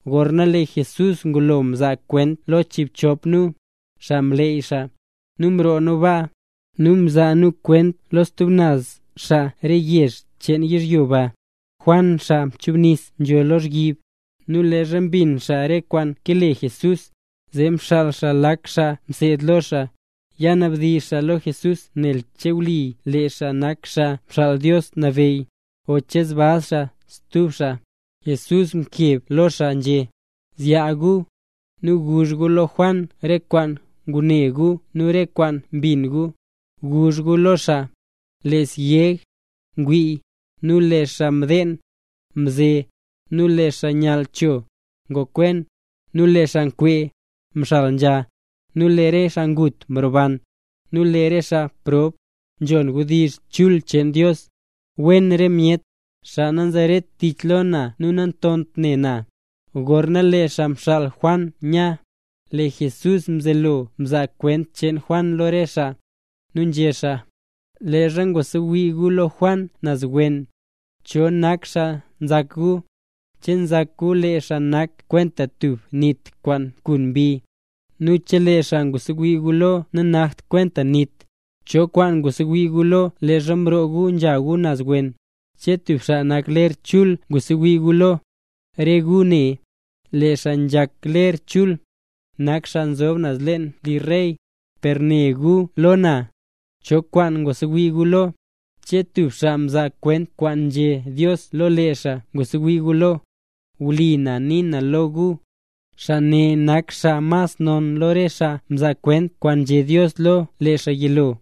Gorna lee Jesús ngulo mzaa kwent lo chiibchop nu, xaa mleey xaa, nu mroo nu baa, nu nzhazaa nu kwent lo stub naz xaa re yezh cheen yizhyo baa. Juan xaa mchubnis nzho lozhyib, nu leezha mbin xaa re kwaan kale Jesús, zee mxaal xaa lak xaa mseed lo xaa, ya nabdizh xaa lo Jesús nen che wlipa lee xaa nak Xaa Xaal Dios Nabeyy, o che zbaz xaa stub xaa. Jesús mkeb lo xaa nzhé: —Zyaa gu, nu guzh gu lo Juan re kwaan ngune gu nu re kwaan mbin gu. Guzh gu lo xaa: “Lee syeg, ngwii; nu lee xaa mdeen, nze; nu lee xaa nyall cho, ngokwen; nu lee xaa nkwee, mxal nzha; nu lee re xaa ngut, nroban; nu lee re xaa prob, nzhon wdizh chul cheen Dios. ¡Wen re myet, xaa nanzeret tich lo na nu nantont ne na!” Gorna lee xaa mxaal Juan nya, lee Jesús mzelo mzaa kwent cheen Juan lo re xaa, nu nzhé xaa: —Leezha ngwasewii gu lo Juan naz wen, ¿cho nak xaa nzak gu? ¿Che nzak gu lee xaa nak kwenta tub nit kwaan nkun mbi? Nu chelee xaa ngwasewii gu lo nanakt kwenta nit, ¿cho kwaan ngwasewii gu lo leezha mroo gu nzha gu naz wen? ¿Che tub xaa nak ler chul ngwasewii gu lo? Re gu ne, lee xaa nzhak ler chul, nak xaa nzob leen li re rey. Per né gu lo na, ¿cho kwaan ngwasewii gu lo? ¿Che tub xaa nzaa kwent kwaan nzhé Dios lo lee xaa ngwasewii gu lo? Wlipa na nii na lo gu, xaa ne nak xaa mas non lo re xaa mzaa kwent kwaan nzhé Dios lo lee xaa yilo.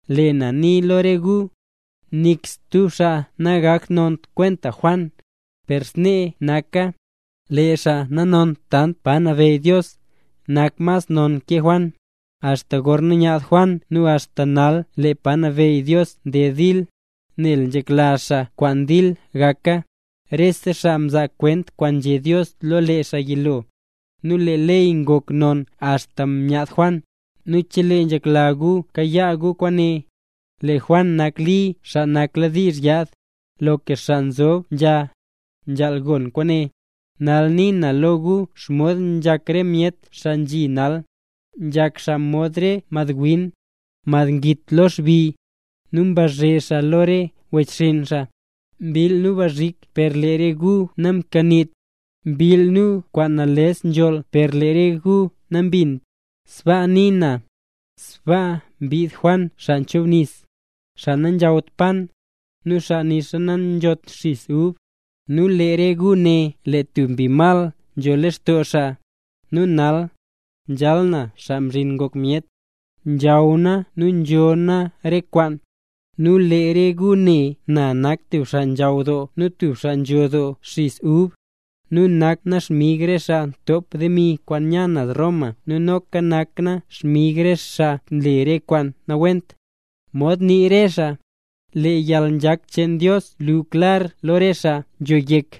Lee na nii lo re gu, nik stub xaa nangoknont kwenta Juan. Per snee naka, lee xaa nanont tant pa nabeyy Dios, nak mas nonra ke Juan. ’Axta gorna myaad Juan nu axta nal lee pa nabeyy Dios nded dil, nel nzhekla xaa kwaan dil gaka. Rese xaa mzaa kwent kwaan nzhé Dios lo lee xaa yilo, nu lee ley ngok non axta myaad Juan. Nu chelee nzhekla gu kayaa gu kwaane, lee Juan nak Li xaa nakladiizh yaad. ¡Loka xaa nzob nzha, nzhaal gon kwaane! ’Nal nii na lo gu xomod nzhak re myet xaa nzhi nal. Nzhak xaa mod re madwin, mad ngit lo xbi, nu mbazhe xaa lo re wechxinn xaa: “Mbill nu bzhik per lee re gu namkaniit, mbill nu kwaan nales nzholl per lee re gu nambinnt”. Sbaa nii na, nel leezha mbid Juan Xaa Nchubnis, xaa nanzhawt pan, nu xaa nixa nanzhot xis ub, nu lee re gu né lee tub mbi mal nzho lextoo xaa. Nu nal, nzhal na Xaa Mzhin Ngok Myet, nzhaw na nu nzho na re kwaan, nu lee re gu né na nak tub xaa nzhaw doo nu tub xaa nzho doo xis ub, nu nak na xmig re xaa ntop demi kwaan nya naz Roma nu noka nak na xmig re xaa nle re kwaan nawent. Mod nii re xaa: “Lee yalnzhak cheen Dios luu klar lo re xaa nzho yek”.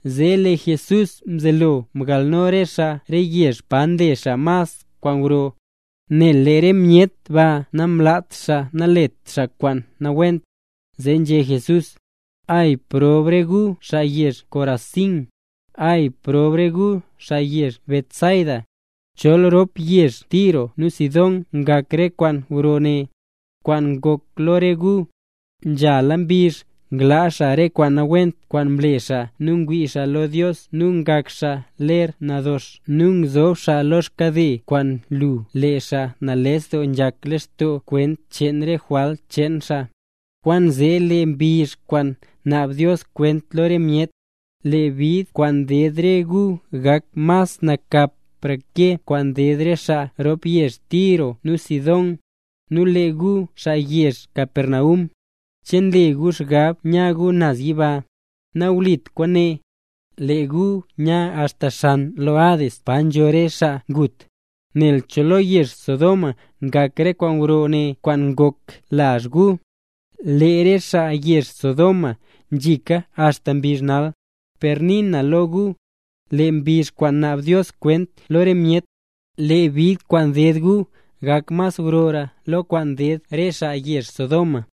Zee lee Jesús mzelo mgalno re xaa re yezh pa mle xaa mas kwaan gro, nel lee re myet baa namlaat xaa naletra xaa kwaan nawent, zee nzhé Jesús: —¡Ay proob re gu xaa yezh Corazín! ¡Ay proob re gu xaa yezh Betsaida! Chol rop yezh Tiro nu Sidón ngak re kwaan gro ne, kwaan ngok lo re gu, nzhala mbizh nglaa xaa re kwaan nawent kwaan mle xaa nu ngwii xaa lo Dios nu ngak xaa ler nadox, nu ngzob xaa lo xkade kwaan lu lee xaa nales doo nzhak lextoo kwent cheen re jwalt cheen xaa. Kwaanzee lee mbizh kwaan naab Dios kwent lo re myet, lee bid kwaan ded re gu gak mas nakapra ke kwaan ded re xaa rop yezh Tiro nu Sidón. Nu lee gu xaa yezh Capernaum, ¿che nle gu xgab nya gu naz yiba? ¡Nawlit kwaane, lee gu nya axta xan lo Hades pa nzho re xaa ngut! Nel chol lo yezh Sodoma ngak re kwaan gro ne kwaan ngok lazh gu, lee re xaa yezh Sodoma ngzhika axta mbizh nal. Per nii na lo gu, lee mbizh kwaan naab Dios kwent lo re myet, lee bid kwaan ded gu gak mas grora lo kwaan ded re xaa yezh Sodoma.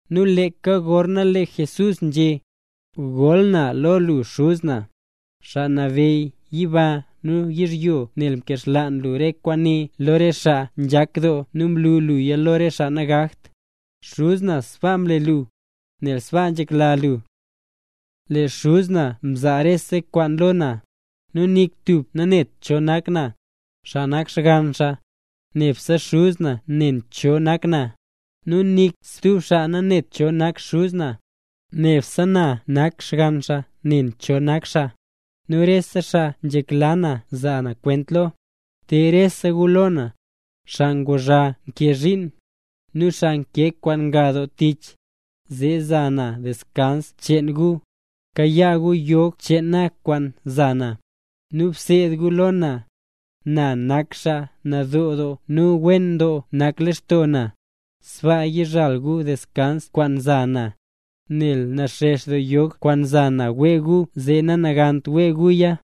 Nu leeka gorzee lee Jesús nzhé: —Goll na lo lu Xuz na, Xaa Nabeyy yiba nu yizhyo nel mkaxlaan lu re kwaane lo re xaa nzhak doo nu mlu luya lo re xaa nagakt. Xuz na sbaa mle lu, nel sbaa nzhekla lu. ’Lee Xuz na mzaa rese kwaan lo na. Nu nik tub nanet cho nak na, xaa nak Xgann xaa, nebse Xuz na ne cho nak na. Nu nik stub xaa nanet cho nak Xuz na, nebse na xaa nak Xgann xaa ne cho nak xaa, nu re xaa nzhekla na zaa na kwent lo. Te rese gu lo na, xaa kwaan nguzha nkee xchiin, nu xaa nkee kwaan nga doo tich, zee za na deskans cheen gu. Kayaa gu yog cheen na kwaan za na, nu bseed gu lo na. Na nak xaa nadoo doo nu wen doo nak lextoo na. Sbaa yizhal gu deskans kwaan nza na. Nel naxex doo yog kwaan za na wee gu zee nanagant wee guya.